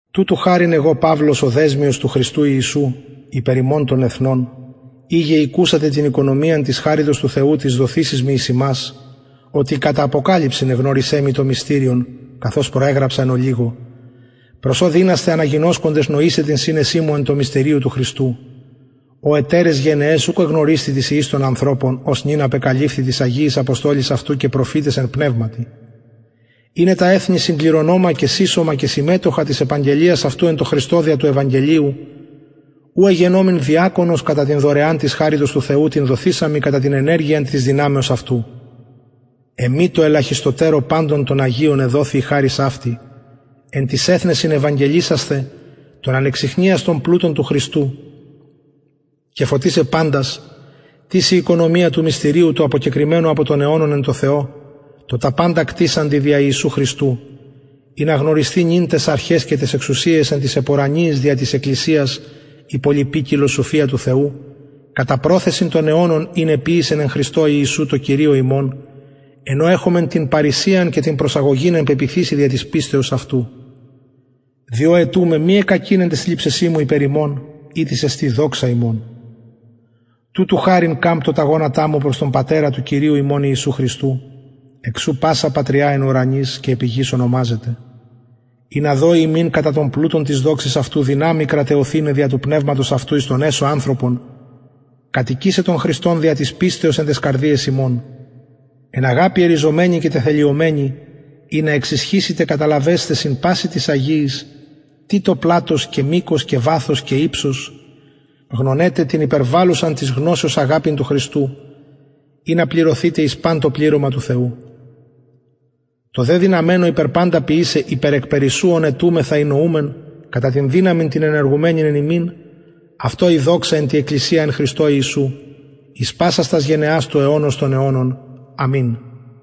τουτου χαριν εγω παυλος ο δεσμιος του χριστου ιησου υπερ υμων των εθνων ειγε ηκουσατε την οικονομιαν της χαριτος του θεου της δοθεισης μοι εις υμας οτι κατα αποκαλυψιν εγνωρισεν μοι το μυστηριον καθως προεγραψα εν ολιγω προς ο δυνασθε αναγινωσκοντες νοησαι την συνεσιν μου εν τω μυστηριω του χριστου ο ετεραις γενεαις ουκ εγνωρισθη τοις υιοις των ανθρωπων ως νυν απεκαλυφθη τοις αγιοις αποστολοις αυτου και προφηταις εν πνευματι ειναι τα εθνη συγκληρονομα και συσσωμα και συμμετοχα της επαγγελιας αυτου εν τω χριστω δια του ευαγγελιου ου εγενομην διακονος κατα την δωρεαν της χαριτος του θεου την δοθεισαν μοι κατα την ενεργειαν της δυναμεως αυτου εμοι τω ελαχιστοτερω παντων αγιων εδοθη η χαρις αυτη εν τοις εθνεσιν ευαγγελισασθαι τον ανεξιχνιαστον πλουτον του χριστου και φωτισαι παντας τις η οικονομια του μυστηριου του αποκεκρυμμενου απο των αιωνων εν τω θεω τω τα παντα κτισαντι δια ιησου χριστου ινα γνωρισθη νυν ταις αρχαις και ταις εξουσιαις εν τοις επουρανιοις δια της εκκλησιας η πολυποικιλος σοφια του θεου κατα προθεσιν των αιωνων ην εποιησεν εν χριστω ιησου τω κυριω ημων εν ω εχομεν την παρρησιαν και την προσαγωγην εν πεποιθησει δια της πιστεως αυτου διο αιτουμαι μη εκκακειν εν ταις θλιψεσιν μου υπερ υμων ητις εστιν δοξα υμων τουτου χαριν καμπτω τα γονατα μου προς τον πατερα του κυριου ημων ιησου χριστου εξ ου πασα πατρια εν ουρανοις και επι γης ονομαζεται ινα δωη υμιν κατα τον πλουτον της δοξης αυτου δυναμει κραταιωθηναι δια του πνευματος αυτου εις τον εσω ανθρωπον κατοικησαι τον χριστον δια της πιστεως εν ταις καρδιαις υμων εν αγαπη ερριζωμενοι και τεθεμελιωμενοι ινα εξισχυσητε καταλαβεσθαι συν πασιν τοις αγιοις τι το πλατος και μηκος και βαθος και υψος γνωναι τε την υπερβαλλουσαν της γνωσεως αγαπην του χριστου ινα πληρωθητε εις παν το πληρωμα του θεου τω δε δυναμενω υπερ παντα ποιησαι υπερ εκπερισσου ων αιτουμεθα η νοουμεν κατα την δυναμιν την ενεργουμενην εν ημιν αυτω η δοξα εν τη εκκλησια εν χριστω ιησου εις πασας τας γενεας του αιωνος των αιωνων αμην